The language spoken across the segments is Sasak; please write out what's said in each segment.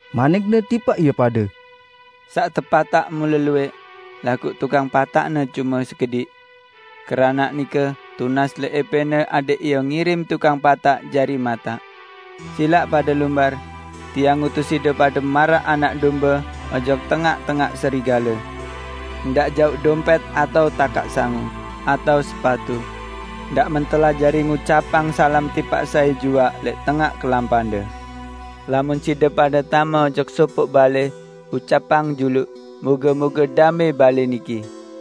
Manik-Ne tipaq ie pade, "Saq tepataq mule luwẽq, laguq tukang pataqne cume sekediq. Keranaq nike tunas lẽq ~Epẽne adẽq Ie ngirim tukang pataq jari mataq. Silaq pade lumbar! Tiang ngutus side pade maraq anak dombe ojok tengaq-tengaq serigale. Ndaq jauq dompẽt atao takaq sangu, atao sepatu. Ndaq mentelah jari ngucapang salam tipaq sai juaq lẽq tengaq kelampande. Lamun side pade tame ojok sopoq balẽ, ucapang juluq, 'Moge-moge damẽ balẽ niki.'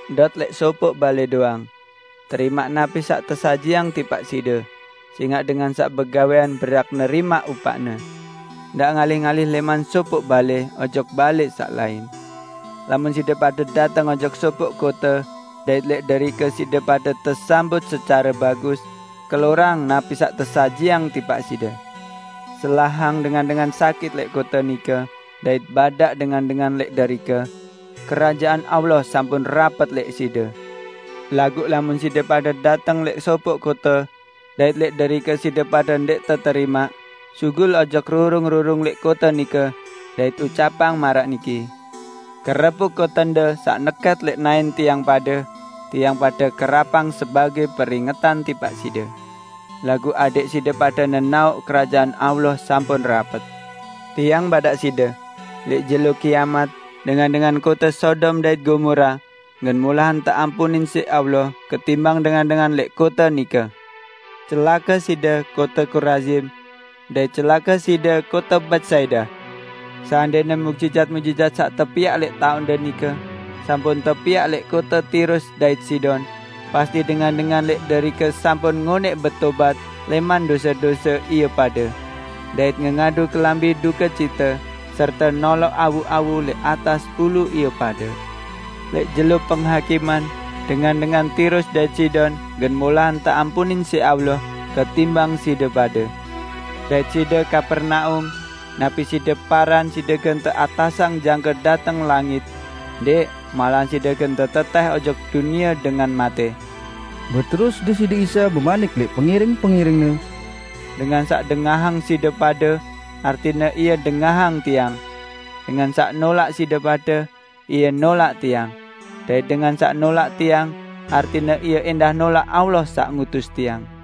Ndot lẽq sopoq balẽ doang. Terimaq napi saq tesajiang tipaq side, sẽngaq dengan saq begawẽan berhak nerimaq upaqne. Ndaq ngalih-ngalih lẽman sopoq balẽ ojok balẽ saq lain. Lamun side pade dateng ojok sopoq kote dait lẽq derike side pade tesambut secare bagus, kelorang napi saq tesajiang tipaq side. Selahang dengan-dengan sakit lẽq kote nike, dait badaq dengan-dengan lẽq derike, 'Kerajaan Allah sampun rapet lẽq side.' Laguq lamun side pade dateng lẽq sopoq kote dait lẽq derike side pade ndẽq teterimaq, sugul ojok rurung-rurung lẽq kote nike dait ucapang maraq niki, 'Kerepuk kotende saq nekẽt lẽq naẽn tiang pade, tiang pade kerapang sebagẽ peringetan tipaq side. Laguq adẽq side pade nenaoq Kerajaan Allah sampun rapet!' Tiang badaq side: Lẽq jelo Kiamat, dengan-dengan kote Sodom dait Gomora gen molahan teampunin siq Allah ketimbang dengan-dengan lẽq kote nike!" "Celake side, kote Korazim! Dait celake side, kote Betsaida! Seandẽne muqjizat-muqjizat saq tepiaq lẽq tengaq-tengaqde nike sampun tepiaq lẽq kote Tirus dait Sidon, pasti dengan-dengan lẽq derike sampun ngonẽq betobat lẽman dose-dose ie pade, dait ngengadu kelambi dukecite serte noloq awu-awu lẽq atas ulu ie pade. Lẽq jelo Penghakiman, dengan-dengan Tirus dait Sidon gen molahan teampunin siq Allah ketimbang side pade! Dait side, Kapernaum! Napi side paran, side gen teatasang jangke dateng langit? Ndẽq! Malahan side gen tetetẽh ojok dunie dengan matẽ!" Beterus Deside Isa bemanik lẽq pengiring-pengiring-Ne, "Dengan saq dengahang side pade, artine ie dengahang Tiang. Dengan saq nolaq side pade, ie nolaq Tiang. Dait dengan saq nolaq Tiang, artine ie ẽndah nolaq Allah saq ngutus Tiang."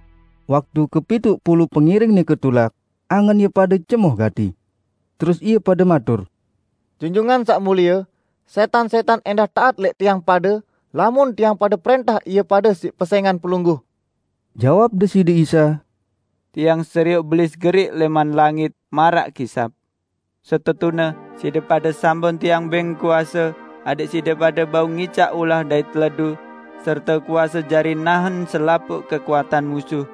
Waktu kepituq pulu pengiring nike tulak, angen ie pade cemoh gati. Terus ie pade matur, "Junjungan Saq Mulie, sẽtan-sẽtan ẽndah taat lẽq tiang pade lamun tiang pade prẽntah ie pade siq pesẽngan Pelungguh!" Jawab Deside Isa, "Tiang serioq Belis geriq lẽman langit maraq kisap. Setetune, side pade sampun Tiang bẽng kuase adẽq side pade bau ngicaq ulah dait teledu serte kuase jari nahen selapuq kekuatan musuh,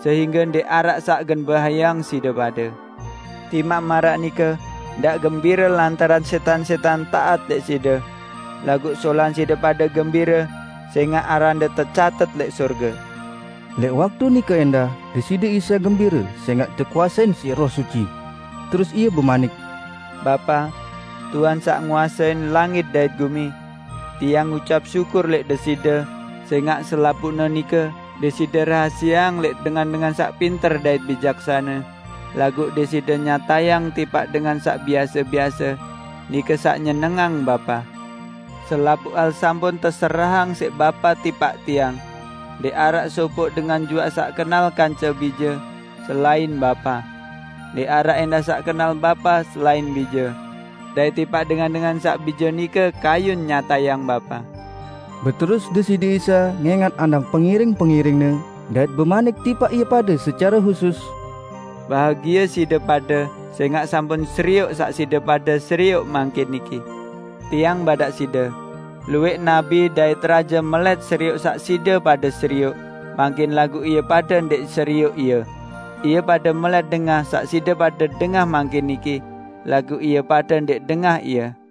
sehingge ndẽq araq saq gen bahayeang side pade. Timaq maraq nike ndaq gembire lantaran sẽtan-sẽtan taat lẽq side. Laguq solahan side pade gembire sẽngaq arande tecatet lẽq sorge." Lẽq waktu nike ẽndah, Deside Isa gembire sẽngaq tekuasein Roh Suci. Terus Ie bemanik, "Bapa, Tuhan saq nguasein langit dait gumi! Tiang ngucap syukur lẽq Deside sẽngaq selapuqne nike Deside rahasieang lẽq dengan-dengan saq pinter dait bijaksane, laguq Deside nyatayang tipaq dengan saq biase-biase. Nike saq nyenengang Bapa. Selapuq hal sampun teserahang siq Bapa tipaq Tiang. Ndẽq araq sopoq dengan juaq saq kenal kance Bije, selain Bapa. Ndẽq araq ẽndah saq kenal Bapa selain Bije; dait tipaq dengan-dengan saq Bije nike kayun nyatayang Bapa." Beterus Deside Isa ngẽngat andang pengiring-pengiring-Ne, dait bemanik tipaq ie pade secare husus, "Bahagie side pade sẽngaq sampun serioq saq side pade serioq mangkin niki. Tiang badaq side: Luwẽq nabi dait raje melẽt serioq saq side pade serioq mangkin laguq ie pade ndẽq serioq ie. Ie pade melẽt dengah saq side pade dengah mangkin niki, laguq ie pade ndẽq dengah ie."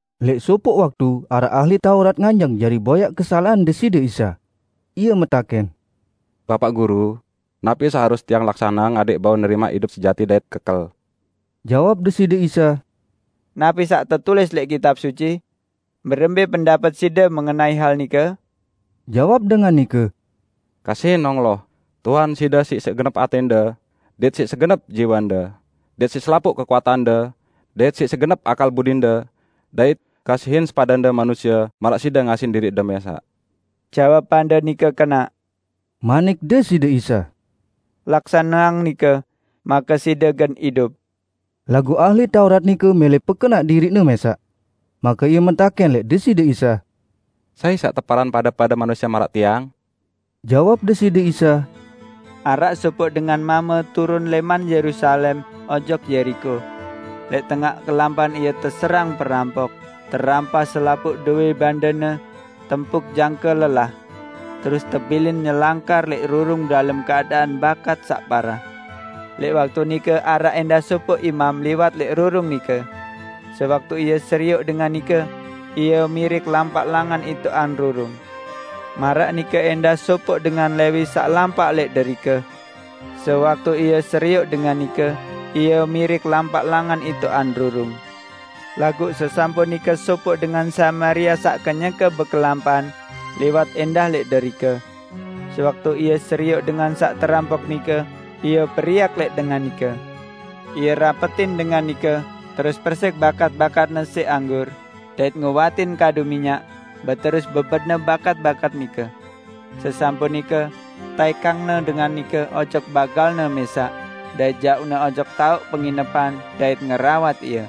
Lẽq sopoq waktu araq ahli Taurat nganjeng jari boyaq kesalaqan Deside Isa. Ie metakẽn, "Bapaq Guru, napi saq harus tiang laksaneang adẽq bau nerimaq idup sejati dait kekel?" Jawab Deside Isa, "Napi saq tetulis lẽq Kitab Suci? Berembẽ pendapet side mengenai hal nike?" Jawab dengan nike, " 'Kasihin Allah, Tuhan side siq segenep atẽnde, dait siq segenep jiwende, dait siq selapuq kekuatande, dait siq segenep akal budinde,' dait 'Kasihin sepadende manusie maraq side ngasihin diriqde mẽsaq.' " "Jawabande nike kenaq," manik Deside Isa. "Laksaneang nike, make side gen idup." Laguq ahli Taurat nike mẽlẽ pekenaq diriqne mẽsaq. Make ie metakẽn lẽq Deside Isa, "Sai saq teparan pade-pade manusie maraq tiag?" Jawab Deside Isa, "Araq sopoq dengan mame turun lẽman Yerusalem ojok Yeriko. Lẽq tengaq kelampan ie teserang perampok, terampas selapuq dowẽ bandene, tempuk jangke lelah, terus tebilin nyelangkar lẽq rurung dalem keadaan bakat saq parah. Lẽq waktu nike araq ẽndah sopoq imam liwat lẽq rurung nike. Sewaktu ie serioq dengan nike, ie mirik lampaq langan itoqan rurung. Maraq nike ẽndah sopoq dengan Lewi saq lampaq lẽq derike; sewaktu ie serioq dengan nike, ie mirik lampaq langan itoqan rurung. Laguq sesampun nike sopoq dengan Samaria saq kenyeke bekelampan, liwat ẽndah lẽq derike. Sewaktu ie serioq dengan saq terampok nike, ie periak lẽq dengan nike. Ie rapetin dengan nike terus persiq bakat-bakatne siq anggur dait ngowatin kadu minyak, beterus bebetne bakat-bakat nike. Sesampun nike, taẽkangne dengan nike ojok bagalne mẽsaq, dait jauqne ojok taoq penginepan dait ngerawat ie.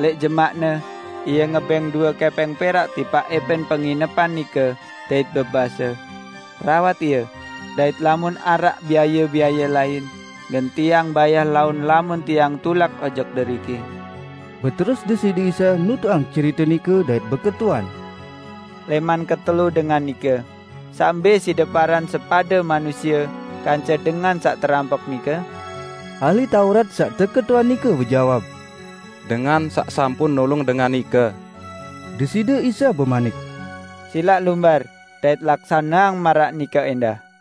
Lẽq jemaqne, ie ngebẽng due kẽpẽng perak tipaq ẽpẽn penginepan nike dait bebase, 'Rawat ie, dait lamun araq biaye-biaye lain, gen tiang bayah laun lamun tiang tulak ojok deriki.' " Beterus Deside Isa nutuqang cerite nike dait beketuan niki, "Lẽman ketelu dengan nike, saq mbẽ side paran sepade manusie kance dengan saq terampok nike?" Ahli Taurat saq teketuan nike bejawab, "Dengan saq sampun nulung dengan nike." Deside Isa bemanik, "Silaq lumbar dait laksaneang maraq nike ẽndah!"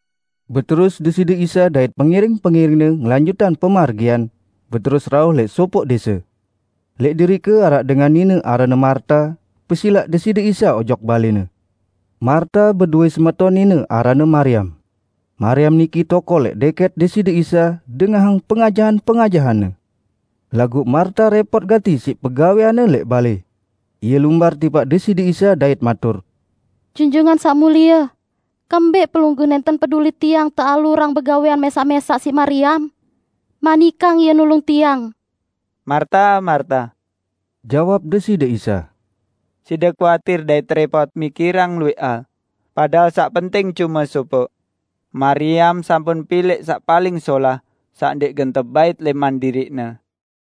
Beterus Deside Isa dait pengiring-pengiring-Ne ngelanjutang pemargian, beterus rauh lẽq sopoq dẽse. Lẽq derike araq dengan nine aranne Marta, pesilaq Deside Isa ojok balẽne. Marta bedowẽ semeton nine aranne Mariam. Mariam niki tokol lẽq dẽkẽt Deside Isa dengahang pengajahan-pengajahan-Ne. Laguq Marta rẽpot gati siq pegawẽanne lẽq balẽ. Ie lumbar tipaq Deside Isa dait matur, "Junjungan Saq Mulie, kembẽq Pelungguh nẽnten peduli tiang tealurang begawẽan mẽsaq-mẽsaq siq Mariam? Manikang ie nulung tiang!" "Marta, Marta!" jawab Deside Isa. "Side kuatir dait rẽpot mikirang luwẽq hal; padahal saq penting cume sopoq. Mariam sampun pilẽq saq paling solah, saq ndẽq gen tebait lẽman diriqne."